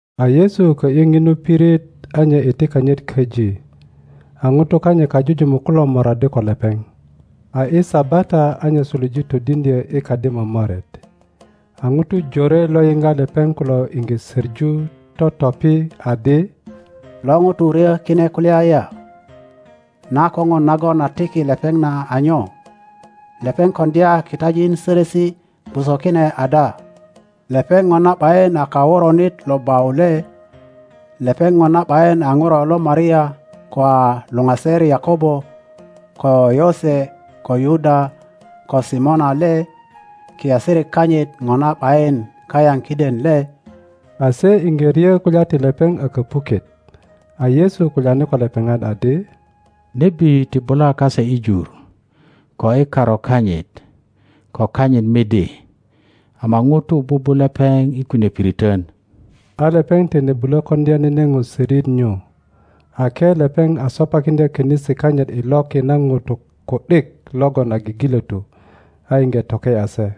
A Yesu kö ’yi ŋinu pirit a nye itikanyit köji, a ŋutu kanyit kajujumuk kulo moraddi ko lepeŋ. a i Sabata a nye suluje todiŋdyö i kadi momoret. A ŋutu jore lo yiŋga lepeŋ kulo iŋge söŋu, totopi adi, Lo ŋuto ryö kine kulya ya? Na koŋon nagon a tiki lepeŋ na a nyo? Lepeŋ koŋdya kitajin sörösi gwoso kine ada? Lepeŋ Ŋona ’bayin a kaworonit lo bau le? Lepeŋ ŋona ’bayin a ŋuro lo Maria ko a luŋaser Yakobo ko Yose ko Yuda ko Simona le? Kiasirik kanyit bona ’bayin kayaŋ kiden le? A se iŋge ryö kulya ti lepeŋ a köpuket. A Yesu kulyani ko lepeŋat adi, Nebi ti bula kase i jur, ko i karu kanyit ko kanyit midi, ama ŋutu bubu lepeŋ i kunie piriton. a lepeŋ tine bulö koŋdya nene ŋo sörit nyu, ake lepeŋ a sopakiŋdya konisi kanyit i loki na ŋutu ku ’dik logon a gigilötu, a iŋge toke ’ya se.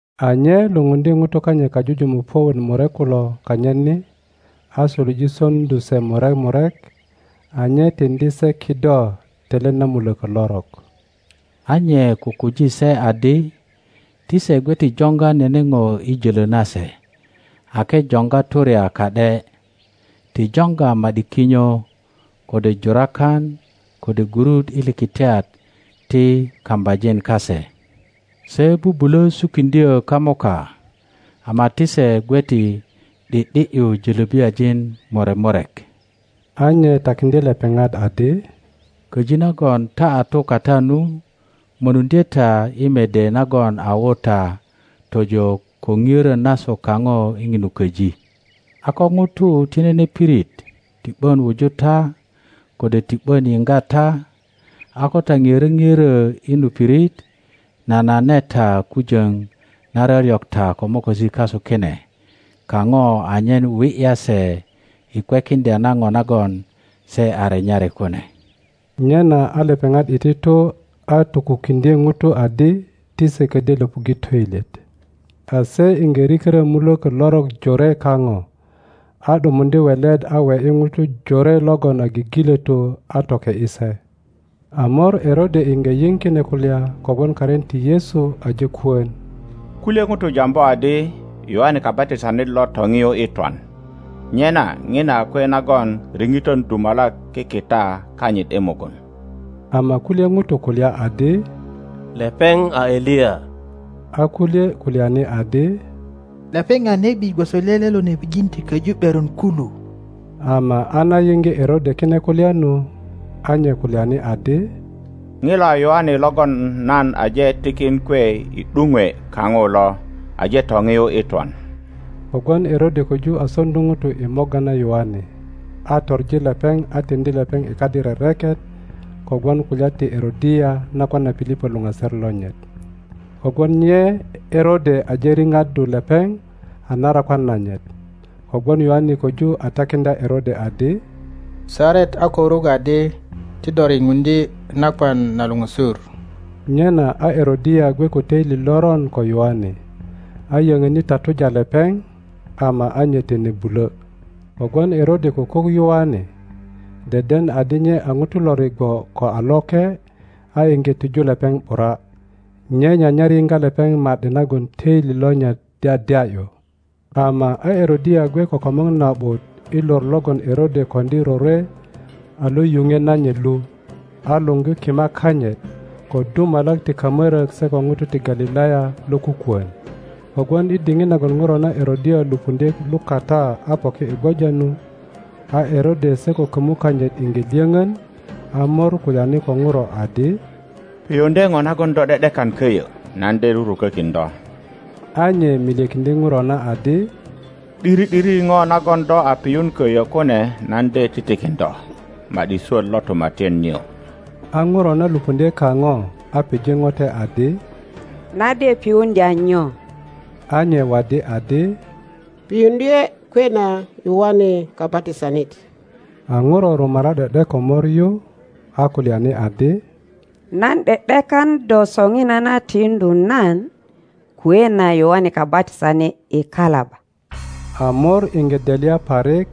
A nye lupundye ŋutu kanyit kajujumuk puök wot murek kulo kanyit ni, a suluje soŋdu se murek murek, a nye tiŋdi se kido telet na mulökö lorok. A nye kukuji se adi ti se gwe ti joŋga nene ŋo i jölö nase ake joŋga turya ka ’de; ti joŋga ma ’di kinyo, kode jurakan, kode gurut i likitiat ti kambajin kase; se bubulö sukiŋdyö kamuka ama ti segwe ti ’di ’di ’yu jolöbiajin murek murek. A nye takiŋdye lepeŋat adi, Köji nagon ta a tu kata nu, mönuŋdye ta i mede nagon a wu ta tojo ko nioro nasu kaŋo i ŋinu köji. A ko ŋutu ti nene pirit ti ’bon wuju ta kode ti ’bon yiŋga ta, a ko ta ŋiörö ŋiörö i nu pirit, nanane ta kujoŋ na ryoryok ta ko mokosi kasu kine kaŋo anyen wi ’ya se i kwekiŋdya na ŋo nagon se a renyari kune. Nyena a lepeŋat iti tu a tokukiŋdye ŋutu adi ti se kodyo löpuŋge toilyet. A se iŋge rikörö muloko lorok jore kaŋo, a ’dumuŋdye welet a we ’yi ŋutu jore logon a gigilotu a toke ’yi se. A mor Erode Erode a kasaranit lo Galilaya iŋge yiŋ kine kulya kogwon karin ti Yesu aje kono. Kulye ŋutu jambu adi Yoane Kabatisanit lo toŋiu i twan, nyena ŋina a kwe nagon riŋitön dumalak kikita kanyit i mugun. Ama kulye ŋutu kulya adi, Lepeŋ a Eliya. A kulye kulyani adi, Lepeŋ a nebi gwoso lele lo nebijin ti koju ’beron kulu. Ama a na yiŋge Erode kine kulya nu, a nye kulyani adi, Ŋilo a Yoane logon nan aje tikin kwe i ’duŋwe kaŋo lo, aje toŋiu i twan. Kogwon Erode koju a soŋdu ŋutu i morga na Yoane, a toŋi lepeŋ atiŋdi lepeŋ i kadi rereket kogwon kulya ti Erodia nakwan na Pilipo luŋaser lonyit, kogwon nye Erode aje riŋaddu lepeŋ a narakwan nanyit. Kogwon Yoane koju a takiŋdya Erode adi, Saret a ko ruk adi ti do riŋuŋdye nakwan na luŋösur. Nyena a Erodia gwe ko toili loron ko Yoane, a yöŋöni tatuja lepeŋ, ama a nye tine bulo; kogwon Erode kukuk Yoane, deden adi nye a ŋuto lo rigwo ko a loke, a iŋge tiju lepeŋ ’bura. Nye nyanyar yiŋga lepeŋ ma ’di nagon töili lonyit dyadya ’yu. Ama a Erodia gwe ko komŋo na ’but i lor logon Erode koŋdi rorwe a lo yuŋwe nanyit lu, a luŋgi kimak kanyit, ko dumalak ti kamorok se ko ŋutu ti Galilaya lo kukwon. Kogwon i diŋit nagon ŋuro na Erodia lupuŋdye lukata a poki i gwoja nu, a Erode se ko komu kanyit iŋge lyoŋon; a mor kulyani ko ŋuro adi, Piyuŋdye ŋo nagon do ’de ’dekan koyo, nan de rurukokin do. a nye milyekiŋdye ŋuro na adi, ’Diri ’diri ŋo nagon do a piyun koyo kune nan de titikin do, ma ’di swot lo tumatyan nio. a ŋuro na lupuŋdye kaŋo, a pije ŋote adi, Nan de piyuŋdya nyo? A nye waddi adi, Piyuŋdye kwe na Yoane Kabatisanit. A ŋuro rumara ’de ’de ko mor yu, a kulyani adi, Nan ’de ’dekan do soŋinana tiŋdu nan kwe na Yoane Kabatisanit i kalaba. a mor iŋge delya parik,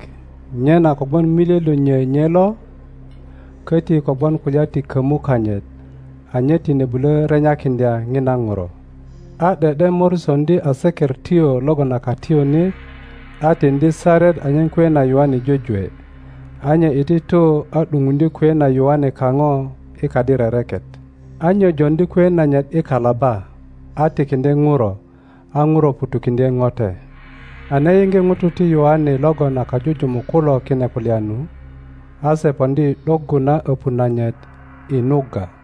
nyena kogwon milye lo nyo nye lo, koti kogwon kulya ti komu kanyit, a nye tine bulo renyakiŋdya ŋina ŋuro. A ’de ’de mor soŋdi asekertyo logon a katiyunit, a tiŋdi saret anyen kwe na Yoane jwejwe. A nye iti tu a ’duŋuŋdye kwe na Yoane kaŋo i kadi rereket, a nye joŋdi kwe nanyit i kalaba a tikiŋdye ŋuro; a ŋuro ŋutukiŋdye ŋote. A na yiŋge ŋutu ti Yoane logon a kajujumuk kulo kine kulya nu, a se poŋdi i ’doggu na öpu nanyit i nugga.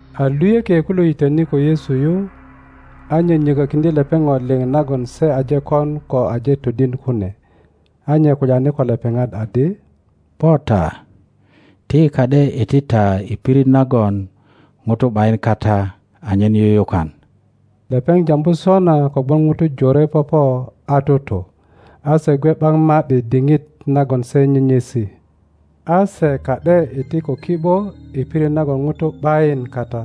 A luyökie kulo yitöni ko Yesu yu, a nyonyo ko kiŋdye lepeŋ ŋo liŋ nagon se aje kon ko aje todin kune. A nye kulyani ko lepeŋat adi, Po ta, ti yi ka ’de iti ta i pirit nagon ŋutu ’bayin kata anyen yuyukan. Lepeŋ jambu sona kogwon ŋutu jore popo a tutu, a se gwe ’bak ma ’di diŋit nagon se nyenyesi. a se ka ’de iti ko ki ’bo i pirit nagon ŋutu ’bayin kata.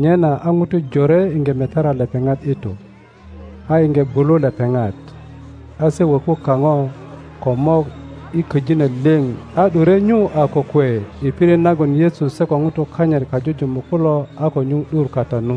Nyena a ŋutu jore iŋge metara lepeŋat i tu, a iŋge gwulu lepeŋat, a se woku kaŋo ko mok i köjino liŋ a ’dure nyu a kokwe i pirit nagon Yesu se ko ŋutu kanyit kajumuk kulo a ko nyuŋ ’dur kata nu.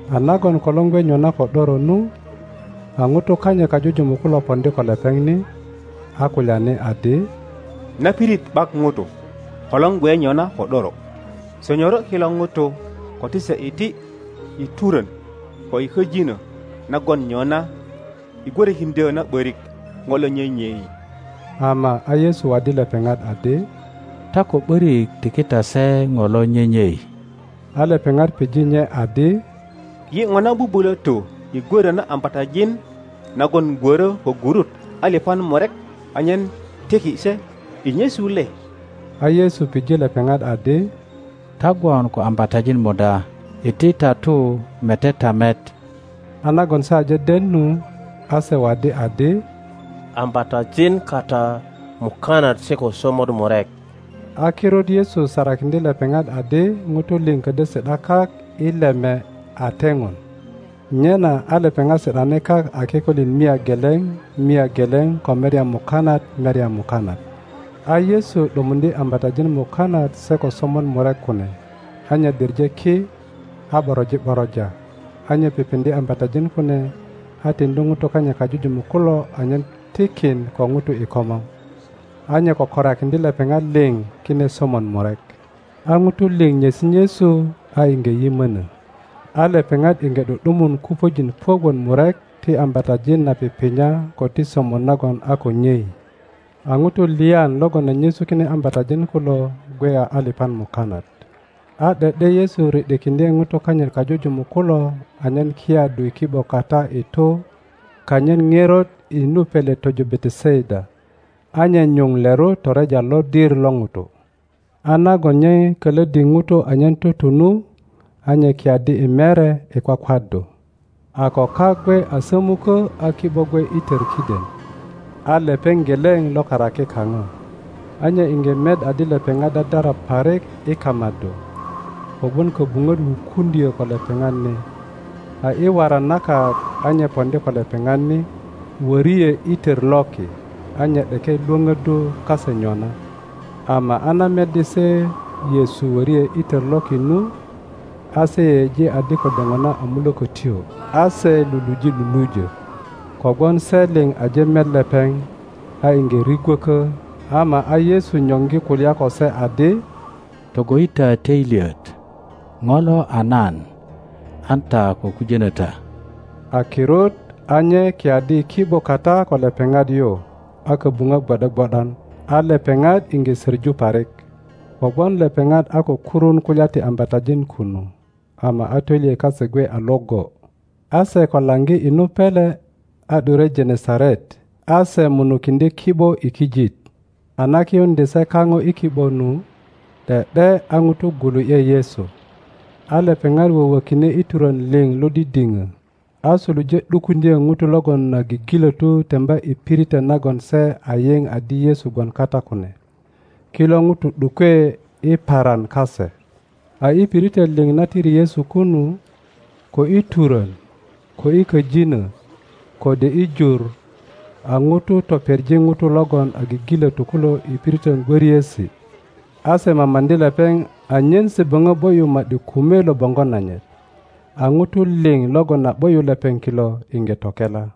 a nagon kolor gwe nyona ko ’doro nu, a ŋutu kanyit kajujumuk kulo poŋdi ko lepeŋ ni, a kulyani adi, Na pirit ’bak ŋutu, kolor gwe nyona ko ’doro; sonyoro kilo ŋutu ko ti se iti i turön ko i köjinö na gwon nyona i gwörokiŋdyö na ’börik ŋo lo nyenyei. Ama a Yesu waddi lepeŋat adi, Ta ko ’börik tiki ta se ŋo lo nyenyei, a lepeŋat pije nye adi, Yi ŋona bubulö tu i gworo na ambatajin nagon gwörö ko gurut alipan murek anyen tiki se i nyesu le? a Yesu pije lepeŋat adi, Ta gwon ko ambatajin muda? Iti ta tu mete ta met. A nagon se aje den nu, a se waddi adi, Ambatajin kata mukanat se ko somot murek. A kirut Yesu sarakindye lepeŋat adi ŋutu liŋ ködyö si ’da kak i leme a teŋon. Nyena a lepeŋat si ’dani kak a kikolin mia geleŋ mia geleŋ ko merya mukanat merya mukanat. A Yesu ’dumuŋdye ambatajin mukanat se ko somot murek kune, a nye diŋe ki, a ’boroji ’boroja, a nye pipiŋdye ambatajin kune, a tiŋdi ŋutu kanyit kajujumuk kulo anyen tikin ko ŋutu i komor. A nye kökorakiŋdye lepeŋat liŋ kine somot murek. a ŋutu liŋ nyesi nyesu a iŋge yimonö. A lepeŋat iŋge ’du ’dumun kupöjin puök wot murek ti ambatajin na pipinya ko ti somot nagon a ko nyei. a ŋutu lyan logon a nyesu kine ambatajin kulo gwe a alipan mukanat. A ’de ’de Yesu ri ’dikiŋdye ŋutu kanyit kajujumuk kulo anyen kiyaddu i ki ’bo kata i tu kanyit ŋerot i nu pele tojo Betesaida, a nye nyuŋ leru toreja lodir lo ŋutu. a nagon nye kölöddi ŋutu anyen tutu nu, a nye kiyaddi i mere i kwakwaddu. a ko kak gwe a sömukö a ki ’bo gwe i tör kiden, a lepeŋ geleŋ lo karaki kaŋo. a nye iŋge met adi lepeŋat dadara parik i kamaddu, kogwon köbuŋöt wukuŋdyö ko lepeŋat ni. A i waran na kak a nye poŋdi ko lepeŋat ni, wöri ’e i tör loki. A nye ’deke lwöpöddu kase nyona. ama a na meddi se Yesu wori ’e i tor loki nu, a se yeyeji adi kode ŋona a mulökötyo, a se luluje lulujö; kogwon se liŋ aje met lepeŋ, a iŋge rigwökö. Ama a Yesu nyoŋgi kulya ko se adi, Togo ’yi ta töilyet, ŋo lo a nan; an ta ko kujönö ta. A kirut a nye kiyaddi i ki ’bo kata ko lepeŋat yu a köbuŋöt gwo ’de gwo ’dan, a lepeŋat iŋge soŋu parik, kogwon lepeŋat a ko kurun kulya ti ambatajin kunu, ama a töilyet kase gwe a iŋgo. A se ko laŋgi i nu pele, a ’dure Genesaret, a se munukiŋdye ki ’bo i kijit. A na kiyuŋdye se kaŋo i ki ’bo nu, ’de ’de a ŋutu gwulu ’ye Yesu; a lepeŋat wowökine i turön liŋ lo didiŋö, a suluje ’dukuŋdyö ŋutu logon a gigilötu temba i piritön nagon se a yiŋ adi Yesu gwon kata kune. Kilo ŋutu ’dukwe i paran kase. a i piritön liŋ na tiri Yesu kunu, ko i turön, ko i köjinö, kode i jur, a ŋutu topeŋi ŋutu logon a gigilötu kulo i piritön gwöriesi. a se mamaŋdi lepeŋ anyen se böŋö ’bo ’yu ma ’di kume lo boŋgo nanyit. A ŋutu liŋ logon a ’bo ’yu lepeŋ kilo iŋge tokela.